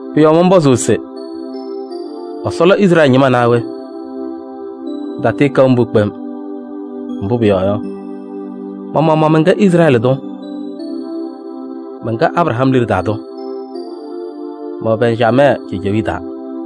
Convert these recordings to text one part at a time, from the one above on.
Pʋ-yɔɔ mɔnpɔzʋʋ se: Ɛsɔ lɔ Izrɛɛlɩ ñɩma naa we? Pɩtatɩɩkɛʋ mbʋ kpem! Mbʋ pʋyɔɔ yɔ, ma-maɣmaɣ mɛnkɛ Izrɛɛlɩ tʋ. Mɛnkɛ Abraham liɖe taa tʋ, mɛwɛ Bɛnjamɛɛ cejewiye taa.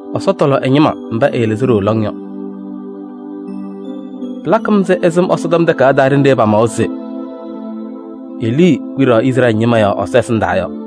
Ɛsɔ tɔlɔ ɛ-ñɩma mba ɛɛlɩzɩ ɖooo lɔŋ yɔ. Pɩlakɩ-m ɛzɩ ɩsɩm Ɛsɔtɔm Takayaɣ taa ɖenɖe pamawa se Elii kpiɖaɣ Izrɛɛlɩ ñɩma yɔɔ Ɛsɔ ɛsɩndaa yɔ.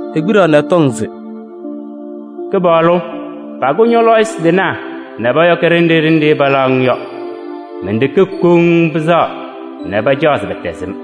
Ekpiɖaɣ nɛ ɛtɔŋ se: “Kɩpaɣlʋ, pakʋ ñɔ-lɔɔyɩsɩ tɩnaa nɛ pɔyɔkɩ ɖenɖe ɖenɖe palaɣ-ŋ yɔ. Men-ɖeke koŋ pɩsɛɣa nɛ pacaɣ se pɛtɛzɩ-m.”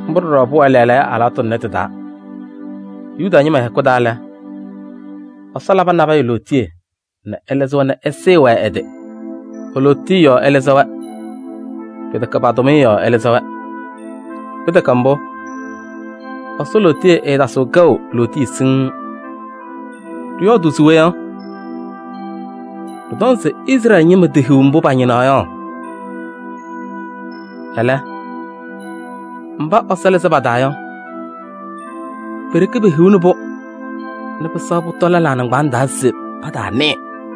Mbʋ ɖɔɖɔ pʋwɛ lɛɛlɛɛyɔ alɩwaatʋ tʋnɛ tɩ-taa: Yuda ñɩma hɛkʋ taa lɛ, Ɛsɔ labɩ nabɛyɛ lootiye nɛ ɛlɩzɩ-wɛ nɛ ɛsɩɩ-wɛ ɛ-tɩ. E-lootiye yɔɔ ɛlɩzɩ-wɛ, pɩtɛkɛ pa-tʋmɩyɛ yɔɔ ɛlɩzɩ-wɛ. Pɩtɛkɛ mbʋ, Ɛsɔ lootiye ɛɛtasɩɣ kɛʋ lootiye siŋŋ. Ɖɩyɔɔdʋʋ se we yɔ? Ɖɩtɔŋ se Izrɛɛlɩ ñɩma tehiɣ mbʋ pañɩnaɣ yɔ. Ɛlɛ, mba Ɛsɔ lɩzɩ pa-taa yɔ, pe-ɖeke pehiɣni-pʋ nɛ pɩsɛɣ pʋtɔ lɛlaa nɩŋgbaaŋ taa se pataanɩɩ.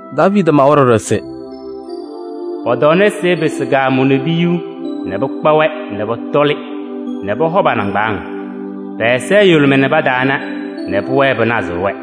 Daaviidi mawa ɖɔɖɔ se: “Pɔ-tɔɔnasɩ ɛpɩsɩ kaamʋʋ nɛ piyuu nɛ pɩkpa-wɛ nɛ pɔtɔlɩ nɛ pɔhɔ pa-nɩŋgbaaŋ. Pɛ-ɛza ɛyʋlʋmɩ nɛ pataana nɛ pʋwɛɛ pɩnazɩɣ-wɛ.”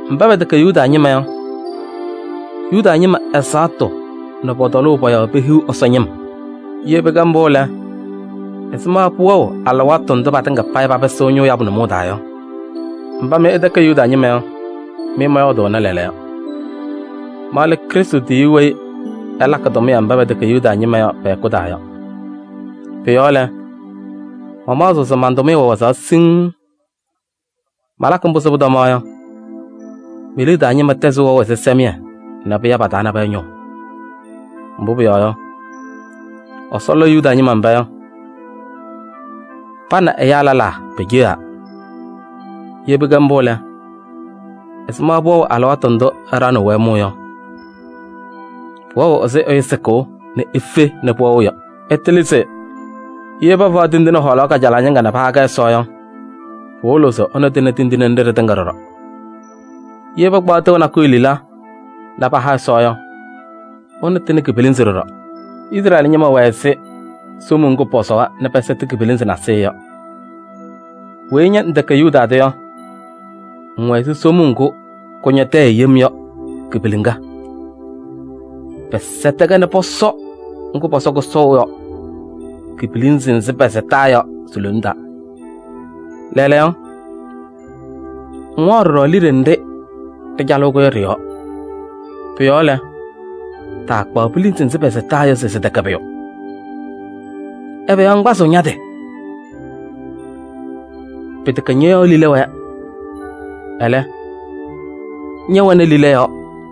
Mba pɛtɛkɛ Yuda ñɩma yɔ, Yuda ñɩma ɛzaɣtʋ nɛ pɔ-tɔlʋʋ pɔ-yɔɔ pehiɣ Ɛsɔ ñɩm. Ye pɩkɛ mbʋ lɛ, ɛzɩma pʋwɛɣ alɩwaatʋ ndʋ patɩŋa payɩ papɩsɩɣ ñʋʋ yabʋ nʋmɔʋ taa yɔ? Mba mɩ ɩtɛkɛ Yuda ñɩma yɔ, mɩ mɔyɔɔdʋʋnɩ lɛɛlɛɛyɔ: ma lɛ Krɩstʋ tiyiyu weyi ɛlakɩ tʋmɩyɛ mba pɛtɛkɛ Yuda ñɩma yɔ pɛ-hɛkʋ taa yɔ. Pʋ-yɔɔ lɛ, mamaɣzɩɣ se man-tʋmɩyɛ wɛ wazaɣ siŋŋ. Malakɩ mbʋ se pʋtɔmaɣ yɔ, me-liɖe taa ñɩma tɛzɩ wɛʋ ɛzɩsɛmɩyɛ nɛ pɩya pa-taa nabɛyɛ ñʋʋ. Mbʋ pʋyɔɔ yɔ, Ɛsɔ lɔʋ Yuda ñɩma mba yɔ ɛ nɛ ɛyaa lɛlaa peceɣaa. Ye pɩkɛ mbʋ lɛ, ɛzɩma pʋwɛɣ alɩwaatʋ ndʋ ɛɖaɣnɩɣ-wɛ mʋʋ yɔ? Pʋwɛɣ ɛzɩ ɛyʋ sɩkʋʋ nɛ efe nɛ pʋwɛɣ yɔ. Ɩtɩlɩ se: ye pafaɣ tindine hɔɔlaɣ kajalaɣ ñɩŋga nɛ paha-kɛ Ɛsɔ yɔ, pɩwɩlɩɣ se ɛnʋ tɩnɩ tindine nɖɩ ɖɩtɩŋa ɖɔɖɔ. Ye pakpaɣ tɩʋ nakʋyʋ lila nɛ paha Ɛsɔ yɔ, ɛnʋ tɩnɩ ki-pilinzi ɖɔɖɔ. Izrɛɛlɩ ñɩma wɛ ɛzɩ somuu ŋgʋ pɔsɔwa nɛ pɛsɛtɩ ki-pilinzi nasɩyɩ yɔ. Weyi ña ŋtɛkɛ Yuda tʋ yɔ, ŋwɛ ɛzɩ somuu ŋgʋ kʋñɔ tɛyɛ yem yɔ ki-piliŋa. Pɛsɛtɩ-kɛ nɛ pɔsɔ ŋgʋ pɔsɔ kʋsɔʋ yɔ ki-pilinzi nzɩ pɛsɛtaa yɔ si-lone taa: lɛɛlɛɛyɔ, ŋwaɣ ɖɔɖɔ liɖe nɖɩ ɖɩcalɩɣ-kʋ yɔ ɖɩ-yɔɔ. Pʋ-yɔɔ lɛ, taakpaɣ pilinzi nzɩ pɛsɛtaa yɔ se sɩtɛkɛ pʋyʋ. Ɛbɛ yɔɔ ŋkpazɩɣ ña-tɩ yɔ? Pɩtɛkɛ ñɔ-yɔɔ lila wɛɛ, ɛlɛ, ñɛwɛnɩ lila yɔɔ.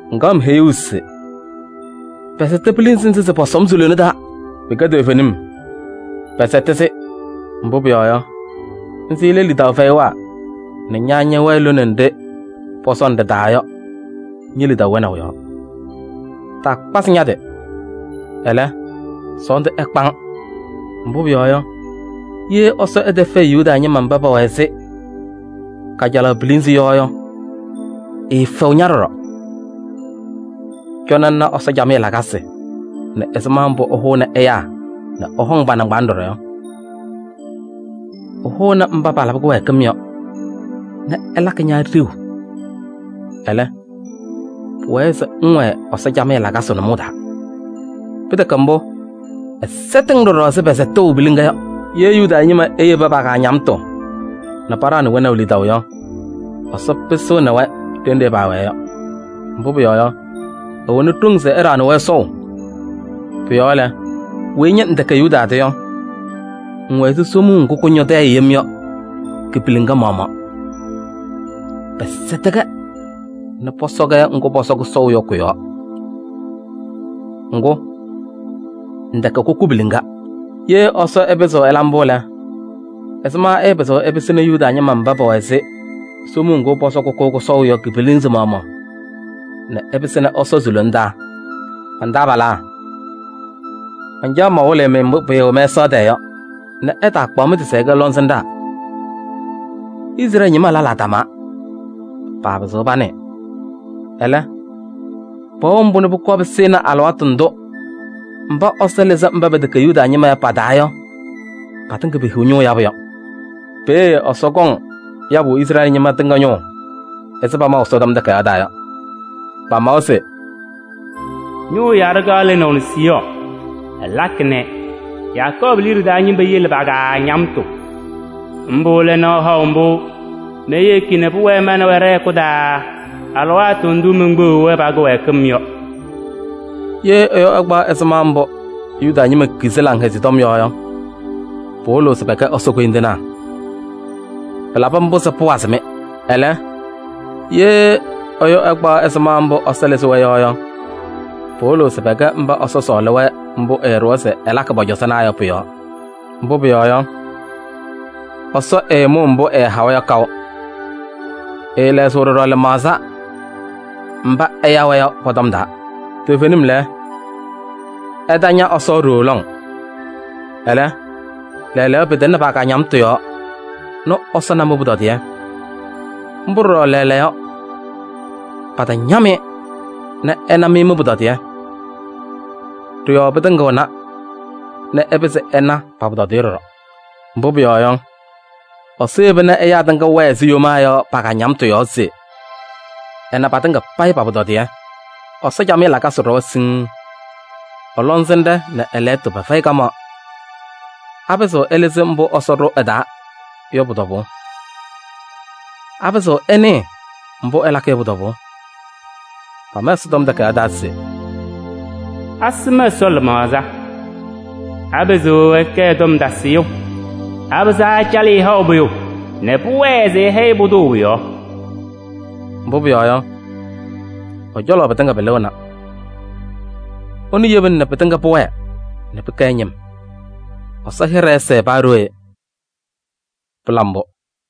Ŋkaɣ-m heyuu se “Pɛsɛtɩ pilinzi nzɩ se pɔsɔ-m si-lone taa.” Pɩkɛ toovenim. Pɛsɛtɩ-sɩ, mbʋ pʋyɔɔ yɔ, nzɩ lɛ lidaʋ fɛyɩwaa nɛ ña ñɛwɛɛ lone nɖɩ pɔsɔ-ŋ ɖɩ-taa yɔ ñe-lidaʋ wɛnaʋ yɔɔ. Taakpazɩ ña-tɩ, ɛlɛ, sɔɔndʋ ɛkpa-ŋ. Mbʋ pʋyɔɔ yɔ, ye Ɛsɔ ɛtɛfɛɛ Yuda ñɩma mba pɛwɛ ɛzɩ kajalaɣ pilinzi yɔ yɔ, ɛɛfɛɣ ña ɖɔɖɔ. Cɔnɩ ŋna Ɛsɔ camɩyɛ lakasɩ nɛ ɛzɩma mbʋ ɛhʋʋnɩ ɛyaa nɛ ɛhɔŋ pa-nɩŋgbaaŋ ɖɔɖɔ yɔ: ɛhʋʋnɩ mba palabɩ kɩwɛɛkɩm yɔ nɛ ɛlakɩ ña ɖeu. Ɛlɛ, pʋwɛɛ se ŋwɛɛ Ɛsɔ camɩyɛ lakasɩ nʋmɔʋ taa. Pɩtɛkɛ mbʋ, ɛsɛtɩɣ-ŋ ɖɔɖɔ ɛzɩ pɛsɛtʋʋ piliŋa yɔ. Ye Yuda ñɩma eyebi pa-kaañamtʋ nɛ paɖaɣnɩ wɛnaʋ lidaʋ yɔ, Ɛsɔ pɩsɩɣnɩ-wɛ ɖenɖe paawɛɛ yɔ. Mbʋ pʋyɔɔ yɔ, ɛwɛnɩ ɖoŋ se ɛɖaɣnɩ-wɛ sɔʋ. Pʋ-yɔɔ lɛ, weyi ña ŋtɛkɛ Yuda tʋ yɔ, ŋwɛ ɛzɩ somuu ŋgʋ kʋñɔ tɛyɛ yem yɔ ki-piliŋa maɣmaɣ: pɛsɛtɩ-kɛ nɛ pɔsɔ-kɛ ŋgʋ pɔsɔ kʋsɔʋ yɔ kʋ-yɔɔ. Ŋgʋ, ŋtɛkɛ kʋkʋ piliŋa. Ye Ɛsɔ ɛpɩzɩɣ ɛla mbʋ lɛ, ɛzɩma ɛɛpɩzɩɣ ɛpɩsɩnɩ Yuda ñɩma mba pɛwɛ ɛzɩ somuu ŋgʋ pɔsɔ kʋkʋ kʋsɔʋ yɔ ki-pilinzi maɣmaɣ nɛ ɛpɩsɩnɩ ɛsɔ si-lona taa? Man-taabalaa, mancaɣ se mawɩlɩ-mɩ mbʋ pɩɩwɛ mɛsaɣ tɛɛ yɔ nɛ ɩtaakpaɣ mɩ-tɩ se ɩkɛ lɔŋsɩnɖaa: Izrɛɛlɩ ñɩma lɛlaa tamaa, paapɩzɩɣ panɩɩ. Ɛlɛ, pɛwɛɣ mbʋ nɛ pʋkɔɔ pɩsɩnɩ alɩwaatʋ ndʋ mba Ɛsɔ lɩzɩ mba pɛtɛkɛ Yuda ñɩma yɔ pa-taa yɔ patɩŋa payɩ pehiɣ ñʋʋ yabʋ yɔ. Peeye Ɛsɔ kɔŋ yabʋ Izrɛɛlɩ ñɩma tɩŋa ñʋʋ ɛzɩ pamaʋ Ɛsɔtɔm Takayaɣ taa yɔ. Pamawa se: “Ñʋʋ yaɖʋ kaɣ lɩnaʋ Siiyɔɔ, ɛlakɩ nɛ Yakɔɔbʋ liɖe taa ñɩma yele pa-kaañamtʋ. Mbʋ lɛ nɔɔ haʋ mbʋ meyeki nɛ pʋwɛɛ ma nɛ wɛ ɖɛ-hɛkʋ taa alɩwaatʋ ndʋ menkpeɣiɣ-wɛ pa-kɩwɛɛkɩm yɔ.” Ye ɛyʋ ɛkpaɣ ɛzɩma mbʋ Yuda ñɩma kizi Laŋhɛzɩyɛ Tɔm yɔ yɔ, pɩwɩlɩɣ se pɛkɛ Ɛsɔ koyindinaa. Pɩlabɩ mbʋ se pʋwazɩ-mɩ. Ɛlɛ, ye ɛyʋ ɛkpaɣ ɛzɩma mbʋ Ɛsɔ lɩzɩ-wɛ yɔ yɔ, pɩwɩlɩɣ se pɛkɛ mba Ɛsɔ sɔɔlɩ-wɛ mbʋ ɛɛɖʋwa se ɛlakɩ pɔ-cɔzɔnaa yɔ pʋ-yɔɔ. Mbʋ pʋyɔɔ yɔ, Ɛsɔ ɛɛmʋʋ mbʋ ɛhawa yɔ kaʋ. Ɛɛlɛɣzɩɣ ɖɔɖɔ lɩmaɣza mba ɛya-wɛ yɔ pɔ-tɔm taa. Toovenim lɛ, ɩtaña Ɛsɔ ɖooo lɔŋ. Ɛlɛ, lɛɛlɛɛyɔ pɩtɩŋnɩ pa-kaañamtʋ yɔɔ nɛ Ɛsɔ na mɩ-pʋtɔdɩyɛ. Mbʋ ɖɔɖɔ lɛɛlɛɛyɔ patañam-ɩ nɛ ɛna mɩ mɩ-pʋtɔdɩyɛ. Ɖɩ-yɔɔ pɩtɩŋɩɣna nɛ ɛpɩzɩ ɛna pa-pʋtɔdɩyɛ ɖɔɖɔ. Mbʋ pʋyɔɔ yɔ, Ɛsɔ yeba nɛ ɛyaa tɩŋa wɛɛ ɛzɩ yomaa yɔ pa-kaañamtʋ yɔɔ se ɛna patɩŋa payɩ pa-pʋtɔdɩyɛ. Ɛsɔ camɩyɛ lakasɩ ɖɔwa siŋŋ! Ɛ-lɔŋsɩnɖɛ nɛ ɛ-lɛɣtʋ pɛfɛyɩ kamaɣ! Apɩzɩɣ ɛlɩzɩ mbʋ Ɛsɔ ɖʋ ɛ-taa yɔ pʋ-tɔbʋʋ? Apɩzɩɣ ɛnɩɩ mbʋ ɛlakɩ yɔ pʋ-tɔbʋʋ? Pama Ɛsɔtɔm Takayaɣ taa se: “Asɩm Ɛsɔ lɩmaɣza? Apɩzɩɣ ɛkɛ ɛ-tɔm tasɩyʋ? Apɩzaa ɛcalɩ-ɩ haʋ pʋyʋ nɛ pʋwɛɛ se ɛhɛyɩ pʋdʋ pʋ-yɔɔ?” Mbʋ pʋyɔɔ yɔ, ɛ-cɔlɔ pɩtɩŋa pɩlɩɣna. Ɛnʋ yebina pɩtɩŋa pʋwɛɛ se pɩkɛ ɛ-ñɩm. Ɛsɔ hɩɖɛ ɛsɛɛ paa ɖooye! Pɩla mbʋ!